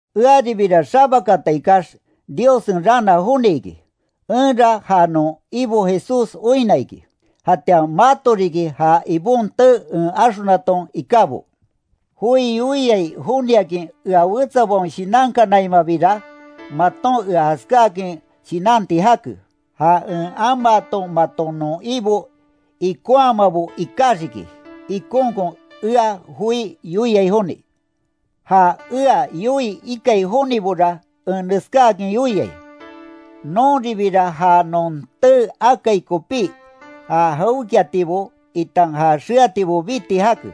Earibira xabakata ikax, Diossen raana joni iki, enra ja non Ibo Jesús oinna iki, jatian mato riki ja Ibon tee en axonaton ikábo. Joi yoiai joniakin ea wetsabaon shinankanaimabira, maton ea jaskáakin shinanti jake. Ja en amaaton maton non Ibo ikonhamabo ikaxiki, ikonkon ea joi yoiai joni. Ja ea yoii ikai jonibora, en neskáakin yoiai: Nonribira ja non tee akai kopí, ja jawékiatibo, itan ja xeatibo biti jake.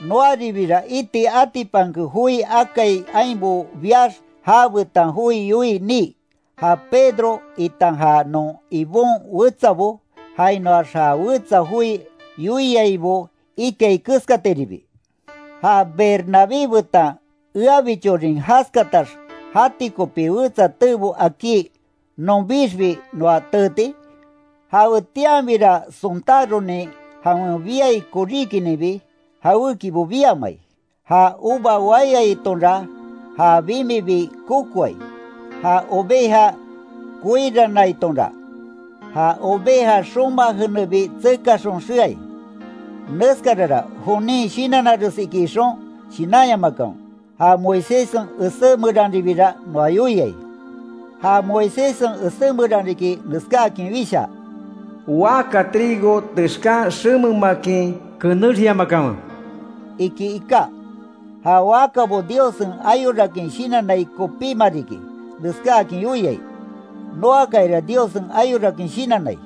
Noaribira iti atipanke joi akai ainbo biax jabetan joi yoii nii, ja Pedro, itan ja non Ibon wetsabo, jainoax ja wetsa joi yoiaibo ikai keskatiribi. ¿Ja Bernabé betan eabichorin jaskatax jati kopí wetsa teebo akí nonbixbi noa teeti? Jawetianbira sontáronin jawen biai koríkininbi, jawékibo biamai, ja uva waiyatonra ja bimibi kokoai, ja oveja koirannaitonra, ja oveja xoma jenebi tsekaxon xeai. Neskarara, jonin shinannares iki ixon, shinanyamakanwe, ja Moiséssen esé meranribira noa yoiai. Ja Moiséssen esé meran riki, neskáakin wishaa: “Waka trigo texkan xememakin, kenexyamakanwe”, iki iká. Ja wakabo Diossen ayorakin shinannai kopíma riki neskáakin yoiai. Noakayara Diossen ayorakin shinannai.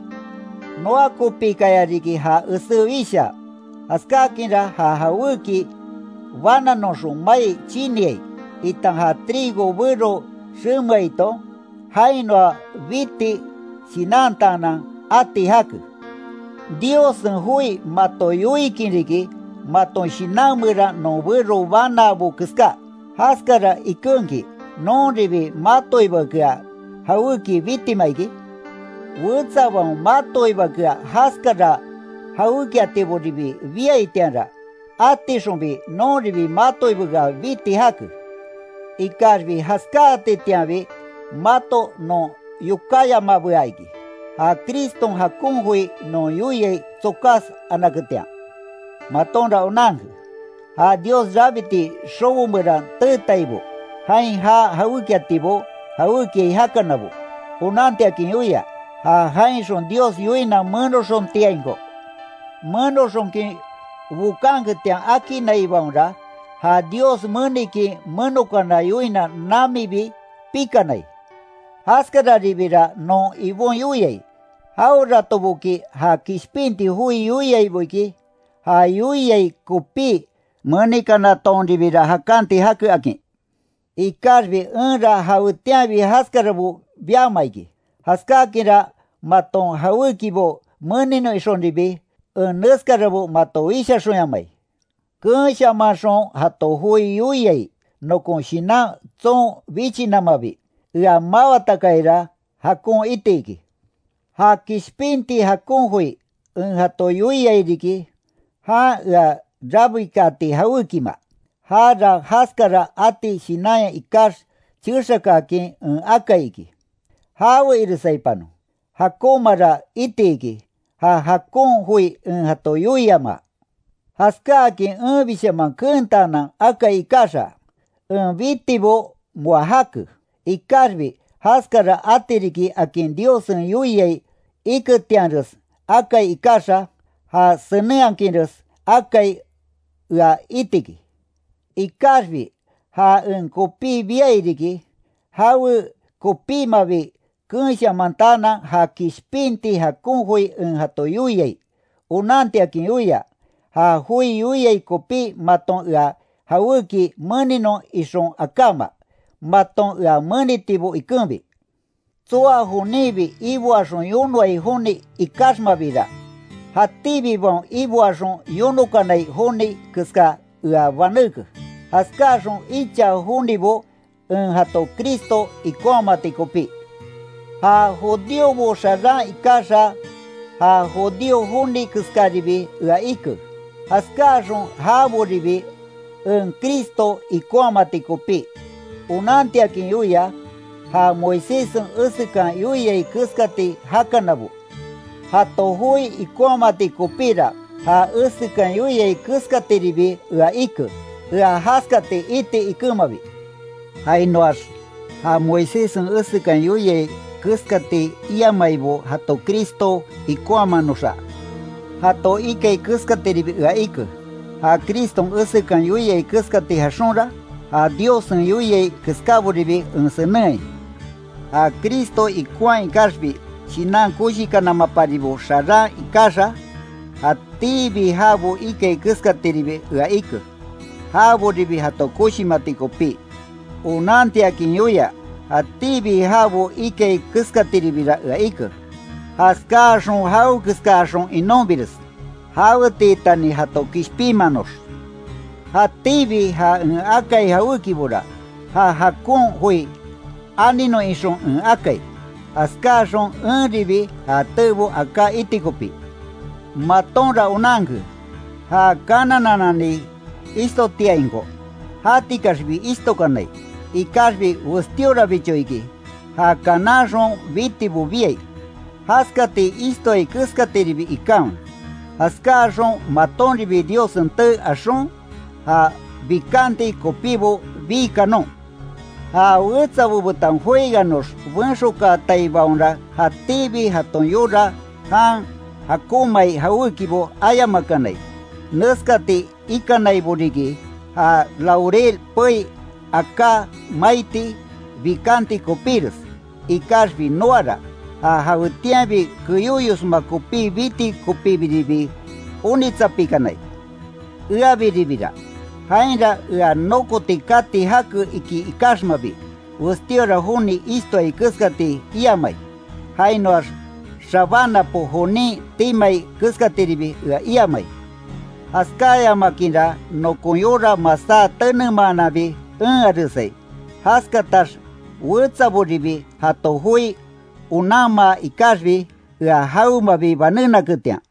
Noa kopikaya riki ja esé wishaa, jaskákinra ja jawéki bananoxon mai chiniai, itan ja trigo bero xemeaiton, jainoa biti shinantaanan ati jake. Diossen joi mato yoikin riki, maton shinan meran non bero banaabo keská, ¿Jaskara ikenki, nonribi matoibakea jawéki bitima iki? Wetsabaon matoibakea jaskara jawékiatiboribi biaitianra, átixonbi nonribi matoibakea biti jake. Ikaxbi jaskáatitianbi mato non yokáyamabea iki, ja Criston jakon joi non yoiai tsokas anaketian. Matonra onanke, ja Dios rabiti xobo meran teetaibo jain jaa jawékiatibo jawékiai jakanabo, onantiakin yoia, ja jainxon Dios yoina menoxontiainko, menoxonkin bokanketian akinaibaonra, ja Dios menikin menokana yoina namibi pikanai. Jaskaribira non Ibon yoiai, jaweratoboki ja kishpinti joi yoiaibo iki, ja yoiai kopí menikanatonribira jakanti jake akin. Ikaxbi enra jawetianbi jaskarabo biama iki, jaskáakinra maton jawékibo meninon ixonribi, en neskarabo mato wishaxonyamai. Keenshamanxon jato joi yoiai, nokon shinan tson bichinamabi, ea mawatakayara, jakon iti iki. Ja kishpinti jakon joi, en jato yoiai riki, jan ea rabikaati jawékima, jara jaskara ati shinanya ikax chexakaakin en akai iki. ¡Jawe iresaipanon, jakonmara itiki ja jakon joi en jato yoiamaa! Jaskáakin enbishaman keentaanan akai ikaxa, en bitibo moa jake, ikaxbi jaskara ati riki akin Diossen yoiai iketianres akai ikaxa, ja senenhakinres akai ea itiki. Ikaxbi ja en kopí biai riki, jawe kopímabi keenshamantaanan ja kishpinti jakon joi en jato yoiai, onantiakin yoia, ja joi yoiai kopí maton ea jawéki meninon ixon akáma, maton ea menitibo ikenbi. Tsoa joninbi iboaxon yonoai joni ikaxmabira, jatíbibaon iboaxon yonokanai joni keska ea banéke, jaskaxon icha jonibo en jato Cristo ikonhamati kopí. Ja judíobo xaran ikaxa ja judío joni keskaribi ea ike, jaskáaxon jaboribi en Cristo ikonhamati kopí, onantiakin yoia, ja Moiséssen esekan yoiai keskati jakanabo, jato joi ikonhamati kopíra, ja esekan yoiai keskatiribi ea ike, ea jaskati iti ikenmabi. Jainoax, ja Moiséssen esekan yoiai keskati iamaibo jato Cristo ikonhamanoxa, jato ikai keskatiribi ea ike, ja Criston esekan yoiai keskati jaxonra, ja Diossen yoiai keskáboribi en senenhai. Ja Cristo ikonhaa ikaxbi shinan koshikanamaparibo xaran ikaxa, jatíbi jabo ikai keskatiribi ea ike, jaboribi jato koshimati kopí, onantiakin yoia, jatíbi jabo ikai keskatiribira ea ike. Jaskáaxon jawekeskaxon inonbires, jawetiitani jato kishpinmanox. Jatíbi ja en akai jawékibora, ja jakon joi aninon ixon en akai, jaskáxon enribi ja teebo aká iti kopí. Matonra onanke, ja kanananani ishtotiainko, jatikaxbi ishtokanai, ikaxbi westíorabicho iki, ja kananxon bitibo biai, jaskati ishtoai keskatiribi ikanwe, jaskáaxon matonribi Diossen tee axon, ja bikanti kopíbo bii kanon. Ja wetsabo betan jueganox benxokaataibaonra jatíbi jaton yora jan jakonmaai jawékibo ayamakanai, neskati ikanaibo riki, ja laurel pei aká maiti bikanti kopíres. Ikaxbi noara, ja jawetianbi keyóyosma kopí biti kopíbiribi onitsapikanai. Eabiribira, jainra ea nokoti kati jake iki ikaxmabi, westíora joni ishtoai keskati iamai, jainoax xabánapo jonin timai keskatiribi ea iamai. Jaskáyamakinra nokon yora masá tenemaananbi enharesai, jaskatax wetsaboribi jato joi onanmaa ikaxbi, ea jawemabi banénaketian.